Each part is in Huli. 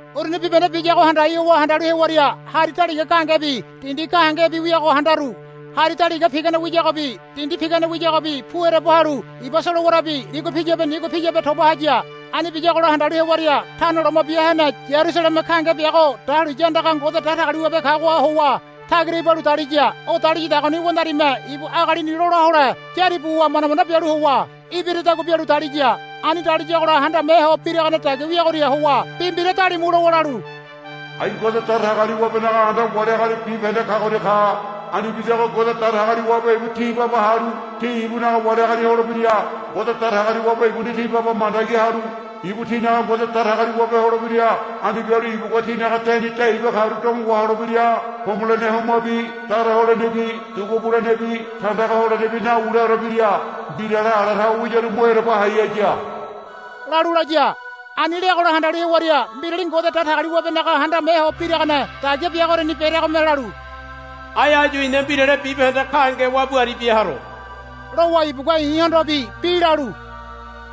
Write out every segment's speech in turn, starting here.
Uruni bibahende biyago handai howa handalu hewaria hari daliga gahengebi dindi gahengebi wiago handaru. Hari daliga pigane wiyagobi dindi pigane wiyagobi pu ereba halu iba solowarabi ligua piyabe nigua piyabe toba haya. Ani biyagola handalu hewaria Tano Loma Bia Hene Yarusaleme gahenge biago dahuliya andaga Ngode Datagaliwabe kagoha howa tagira ibalu daliya. O daliyadagoni wandarime ibu agalini lola hole yári buwa manda manda bialu howa ibiradagua bialu daliya. Ani daliagola handame ho biragane dagia wiagoria howa bi mbira dalimu lowa lalu, Ai Ngode Datagaliwabenaga anda wali agali bibahende kagoria ka. Ani bidago Ngode Datagaliwabe ibu ti baba halu ti ibunaga wali agali holebira. Ngode Datagaliwabe ibuni ti baba mandagi halu ibu tinaga Ngode Datagaliwabe holebira. Ani bialu ibugua tinaga deni de iba karu domo waholebira. Homolene homabi dara holenebi dugu bulenebi tandaga holenebi nawuleore bira. Mbirale ala tawe wiyaru mo ereba hai haya, lalu laya. Ani leagola handalu hewaria mbirali Ngode Datagaliwabenaga handame ho biragane dagia biagoriani bereagome lalu, Ai áyu i̱na mbirale bibahende gahenge wabu aribia haro, lowa ibugua i̱hondobi bi lalu,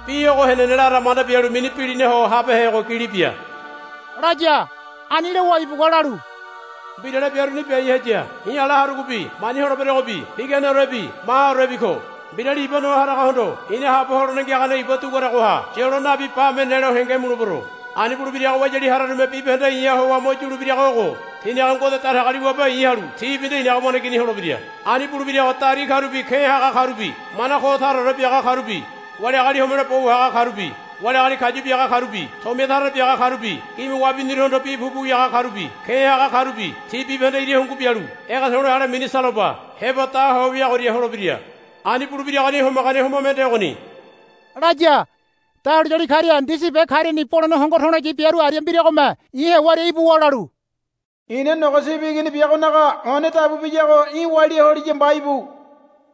Bi ogo henene lara manda bialu mini bilinaho habehego gili bia, laya. Ani lowa ibugua lalu, Mbirale biaruni biai haya. I̱ ala harugobi mani holeberogobi piganeorebi mahaorebi ko. Mbirali iba noa haragohondo i̱na haabo holene ngiagane iba duguaragoha yolo nabi bame nelo henge mulebero. Ani buleberogo wayali hararume bibahende i̱ha howa mo yulebirago ogo. Tinaga Ngode Datagaliwabe i̱ halu tibi nde i̱naga waneigini holebira. Ani bulebirago dari karubi ke̱ haga karubi mana ko taraore biaga karubi wali agali homelo bo wahaga karubi wali agali kayu biaga karubi tomia tara tara biaga karubi gime wabiniruhondo bi pupu wiaga karubi ke̱ haga karubi ti bibahende ira hungu bialu ege to̱le̱ ale mini saloba heba da ho wiagoria holebira. Ani bulebiragoni homagane homa mende ogoni, laya. Dahuliyali karia ndisi be kariani bolene hongo to̱loyi biaru aria mbiragome i̱ hewaria ibuwa lalu, I̱na Nogo Sibi Igini biagonaga one dabu biyago í̠ walia holiya mba íbu,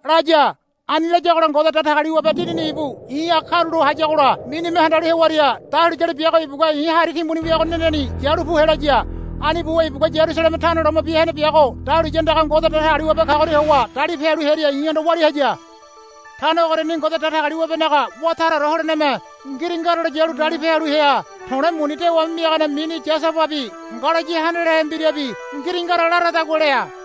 laya. Ani layagola Ngode Datagaliwabe Dinini ibu i̱ha karulo hayagola minime handalu hewaria dahuliyali biago ibugua i̱ hari timbuni weago neneni yalu pu helaya. Ani buwa ibugua Yarusaleme Tano Loma Bia Hene biago dahuliya andaga Ngode Datagaliwabe kagoria howa dalipe halu hearia i̱hondo walia haya. Tano ogoriani Ngode Datagaliwabenaga wá taraore holeneme ngiringaralo yalu dalipe halu hea. To̱le̱ muni dewame miagane mini yasababi ngalayi handalehe mbirabi ngiringara laradagua lea.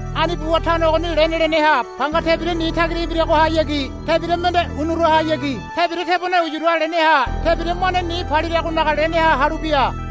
Ani buwa tano ogoni lene leneha panga tebira ni tagira ibiragohayagi tebira mende unurahayagi tebira tebone uyura leneha tebira mane ni paliragonaga leneha halu bia.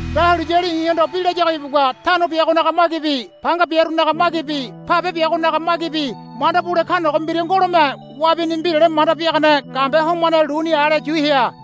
Dahuliyali i̱hondo bi layago ibugua tano biagonaga magibi panga biarunaga magibi pabe biagonaga magibi manda bule kanogo mbira ngolome wabini mbirale manda biagane gambe homane luni ale yu hea.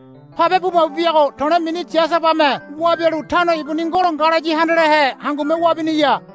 Pabe bu mabu biago to̱le̱ mini yasabame wabialu tano ibuni ngolo ngalayi handalehe hangume wabiniya.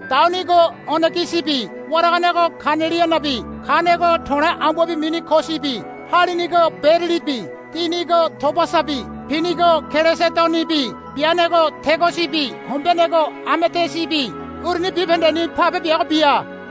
daunigo onegisibi waraganego kanelianabi kanego to̱le̱ ambuabi mini kosibi halinigo berilibi dinigo tobasabi pinigo kelesedonibi beanego tegosibi hombeanego amedisibi uruni bibahendeni pabe biago bia.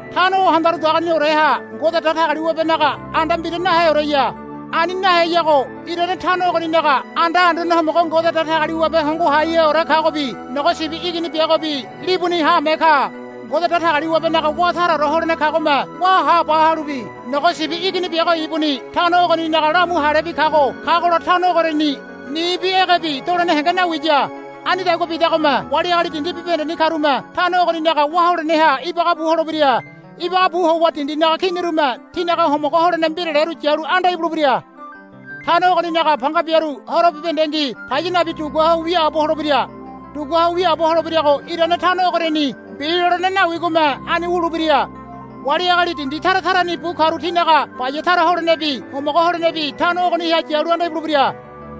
Tano o handarudagonioreha Ngode Datagaliwabenaga anda mbira naheoreya. Ani naheyago irane tano ogoninaga anda Anduane Homogo Ngode Datagaliwabe Hongo Haiheore kagobi Nogo Sibi Igini biagobi libuni haame ka. Ngode Datagaliwabenaga wá taraore holene kagome wá haba halubi Nogo Sibi Igini biago ibuni tano ogoninaga lamu halebi kago kagola tano ogoriani nibi egebi dolene henge nawiya. Anidagua bidagome wali agali dindi bibahendeni karume tano ogoninaga wá holeneha ibaga bu holebira. Ibaga bu howa dindinaga kinirume tinaga homogo holene mbiraleru yalu anda ibulebira. Tano ogoninaga panga biaru horo bibahendengi paya nabi dugua ho wiaabo holebira. Dugua ho wiaabo holebirago irane tano ogoriani mbi lolene nawigome ani wulebira. Wali agali dindi tara tarani bu karu tinaga baya tara holenebi homogo holenebi tano ogoniha yalu anda ibulebira.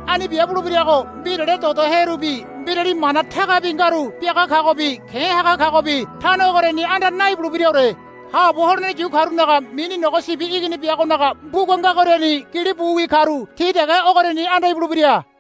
Ani bia bulebirago mbirale dodoherubi mbirali mana tagabi ngaru biaga kagobi ke̱ haga kagobi tano ogoriani anda naibulebiraore. Haabo holene yu karunaga mini Nogo Sibi Igini biagonaga mbuga ngagoriani gili buwi karu ti dege ogoriani anda ibulebira.